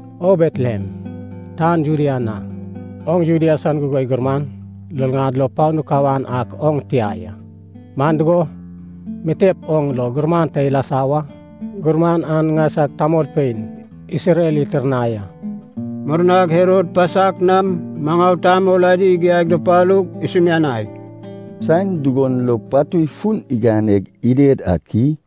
‘O Betlehem, tan Judea na, oŋ Judea san gugoi gurman luluŋad lo panu kawan ak oŋ tia ya. Man dugo, mitep oŋ lo gurman ta ilasa wa. Gurman an ŋaisag tamolpein Isrel itirnai a.’” Murnag Herod pasak nam maŋau tamol adi igiaig dupalug isumianai, “Saen dugon lo patui fun iganeg ided ak i?”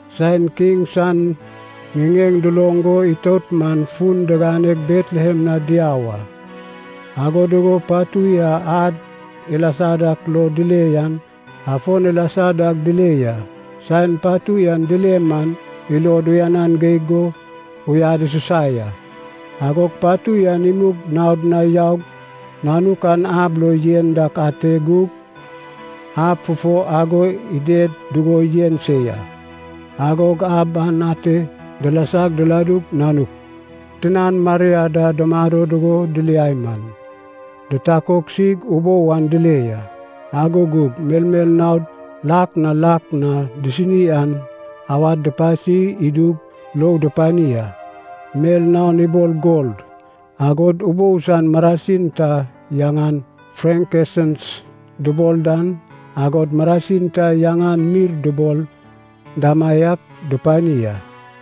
Saen kiŋ san ŋiŋeŋ duloŋ go itout man fun diganeg Betlehem na diau a. Ago dugo patui a ad ilasa dak lo dile yan, afon ilasa dag dile ya. Saen patui an dile man ilod uyanan geig go uyad isusa ya. Agog patui an imug naod na yaug, nanuk ab a lo yen dak ate gug, ab fufo ago ided dugo yen se ya. Agog ab an ate dilasag diladug, nanuk tinan Maria da dumado dugo diliai man, ditakoksig ubou an dile ya. Ago gug melmel naod lak na lak na disini an, awad dupasi idug lou dupani a. Mel naon ibol gol, agod ubou san marasin ta yaŋan frankensens dubol dan, agod marasin ta yaŋan mirr dubol damaiak dupani a.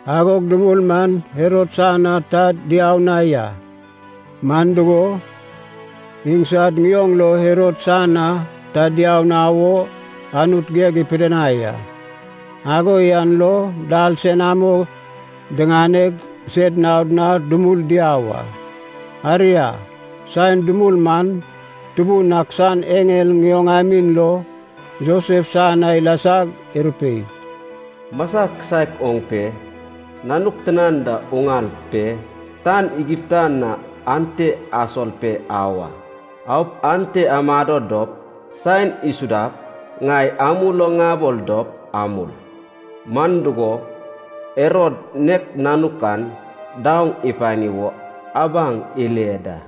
Agog dumul man Herod san na ta diau na ya, man dugo, insad ŋioŋ lo Herod san na ta diau na wo Anut geg ipidinai a. Ago yan lo dal senamo diŋaneg sed naod na dumul diau a. Aria, saen dumul man Tubun ak san eŋel ŋioŋamin lo Josef san na ilasag irupei, “Masa kisaek oŋ pe nanuk tinan da uŋal pe tan Egipta na ante asol pe au a. Aup ante amado dop saen isudap ŋai amul o ŋabol dop amul. Man dugo, Herod nek nanuk an daoŋ ipani wo abaŋ ile da.”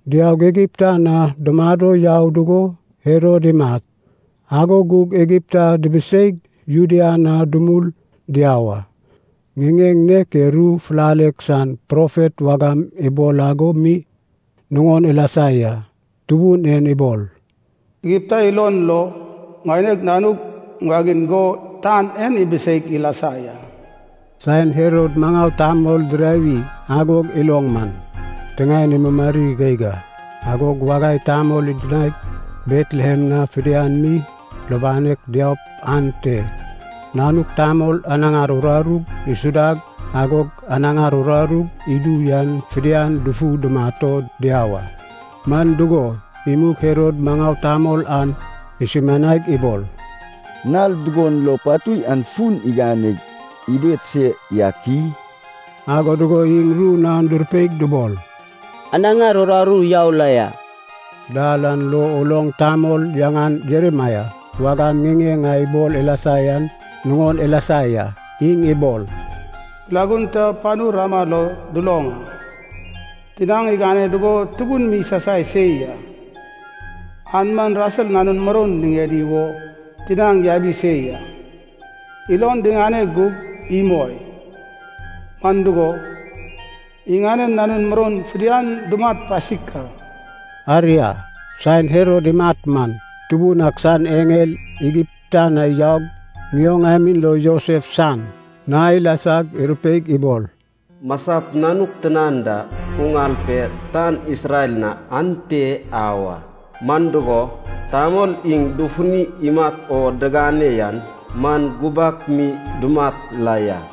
Diaug Egipta na dumado yau dugo Herod imat. Ago gug Egipta dibiseig Judea na dumul diau a. Ŋiŋeŋ nek e ru fulalek san profet wagam ibol ago mi nuŋon ilasa ya. Tubun en ibol, “Egipta ilon lo ŋaineg nanug ŋuwagiŋ go tan en ibiseig ilasa ya.” Saen Herod maŋau tamol dirawi ago iloŋ man, tiŋaen imumari geig a. Agog wagai tamol idinaig Betlehem na fidian mi lubanek diaup ante nanuk tamol anaŋar urarug isuda agog anaŋar urarug idu yan fidian dufu dumat o diau a. Man dugo, imug Herod maŋau tamol an isumianaig ibol, “Nal dugon lo patui an fun iganeg ided se yak i?” Ago dugo iŋ ru naon durupeig dubol, “Anaŋar uraru yau la ya.” Dal an lo uloŋ tamol yaŋan Jeremaia wagam ŋiŋeŋ a ibol ilasa yan nuŋon ilasa ya. Iŋ ibol, “Kilagun ta panu Ramah lo duloŋ a, tinaŋ igane dugo tubun mi isasai se ya. An man Rasel nanun muroun niŋedi wo tinaŋ yabi se ya. Ilon diŋane gug imoi, man dugo, iŋanen nanun muroun fidian dumat pasik a.” Aria saen Herod imat man, Tubun ak san eŋel Egipta na yaug ŋioŋamin lo Josef san na ilasag irupeig ibol, “Masap nanuk tinan da uŋal pe tan Isrel na ante au a. Man dugo, tamol iŋ dufuni imat o digane yan man gubak mi dumat la ya.”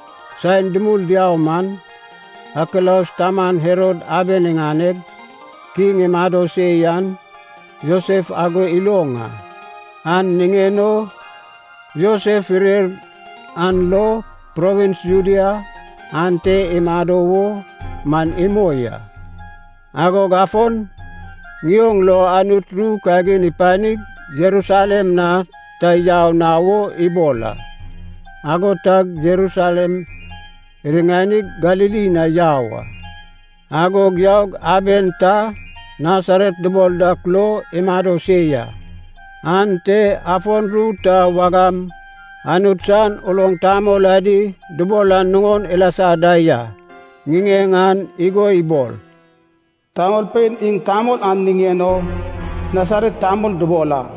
Saen dumul diau man, Akilaus taman Herod aben iŋaneg kiŋ imado se yan Josef ago iloŋ a. An niŋen o Josef irer an lo provins Judea ante imado wo man imoi a. Agog afon ŋion lo Anut ru kagin ipanig Jerusalem na ta yau na wo ibol a. Ago tag Jerusalem iriŋanig Galili na yau a. Agog yaug aben ta Nasaret dubol dak lo imado se ya. Ante afon ru ta wagam Anut san uloŋ tamol adi dubol an nuŋon ilasa da ya. Ŋiŋeŋ an igo ibol, “Tamolpein iŋ tamol an niŋen o Nasaret tamol dubol a.”